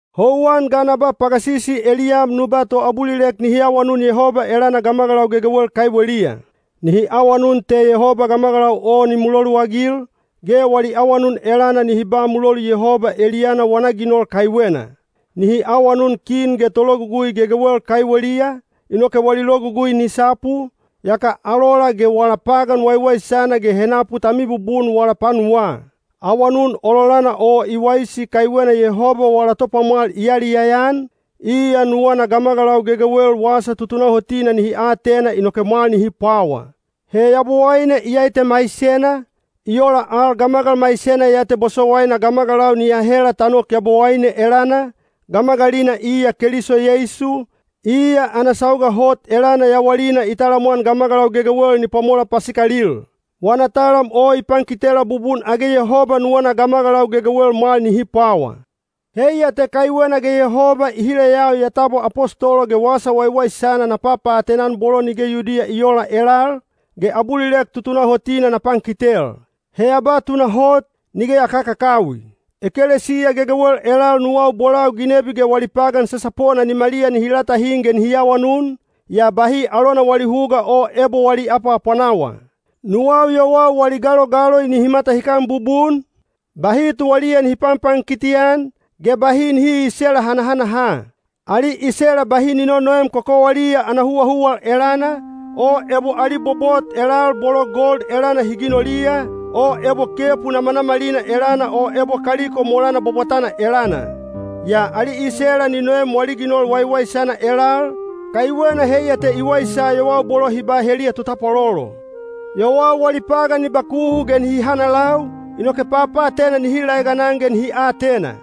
Houwan ga na ba pagasisi eliyam nu ba toabulilek nihi awanun Yehoba elana gamagalau gegewel kaiweliya. Nihi awanun te Yehoba ni label, ge wali awanun elana nihi ba mulolu kaiweliya. Nihi awanun kin ge tologugui gegewel kaiweliya, inoke wali logugui ni sapu, yaka alola ge wala pagan waiwaisana ge henapu ta mibubun wala panuwaa. Awanun ololana o i waisi kaiwena Yehoba wala Topwamwal i yaliyaya-an, iya nuwana gamagalau gegewel wasa tutunahotina nihi atena inoke mwal nihi pwawa. He Yabowaine iyai te maisena, i ola al gamagal maisena ya te bosowaina gamagalau ni ahela ta nok Yabowaine elana, gamagalina iya Keliso Yeisu, iya ana sauga hot elana yawalina i talamwan gamagalau gegewel ni pwamola pasikalil. Wana talam o i pankitela bubun age Yehoba nuwana gamagalau gegewel mwal nihi pwawa. Heiya te kaiwena ge Yehoba i hileyau ya tabwa apostolo ge Wasa Waiwaisana na papaatena-an bolo nige Yudiya i oola elal, ge abulilek tutunahotina na pankitel. He ya ba tunahot, nige ya kakakawi. Ekelesiya gegewel elal nuwau bolau ginebi ge wali pagan sasapona nimaliya nihi latahin ge nihi awanun, yaa bahi alona wali huga o ebo wali apwaapwanawa. Nuwau yowau wali galogaloi nihi matahikan bubun, bahi tuwaliya nihi panpankiti-an, ge bahi nihi iisela hanahanaha. Ali isela bahi ni nonoem kokowaliya ana huwahuwal elana, o ebo ali bobot elal bolo gold elana hi ginoliya, o ebo kepu namanamalina elana o ebo kaliko molana bwabwatana elana. Yaa ali isela ni noem wali ginol waiwaisana elal, kaiwena heiya te i waisa yowau bolo hi ba heliya totapwalolo. Yowau wali pagan ni bakuhu ge nihi hanalau, inoke papaatena nihi laeganan ge nihi atena.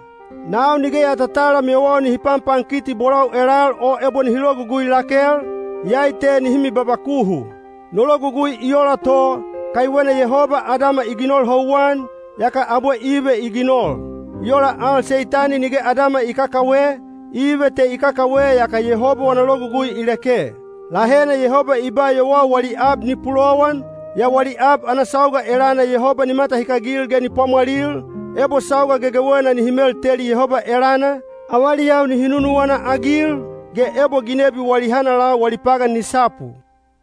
Nau nige ya tatalam yowau nihi panpankiti bolau elal o ebo nihi logugui lakel, iyai te nihi mibabakuhu. No logugui i ola to, kaiwena Yehoba Adama i ginol houwan, yaka abwe Ive i ginol. I ola al Seitani nige Adama i kakawe, Ive te i kakawe yaka Yehoba wana logugui i leke. Lahena Yehoba i ba yowau wali ab ni pulowan, yaa wali ab ana sauga elana Yehoba ni matahikagil ge ni pwamwalil, ebo sauga gegewena nihi melteli Yehoba elana, avaliyau nihi nunuwana-agil, ge ebo ginebi wali hanalau wali pagan ni sapu.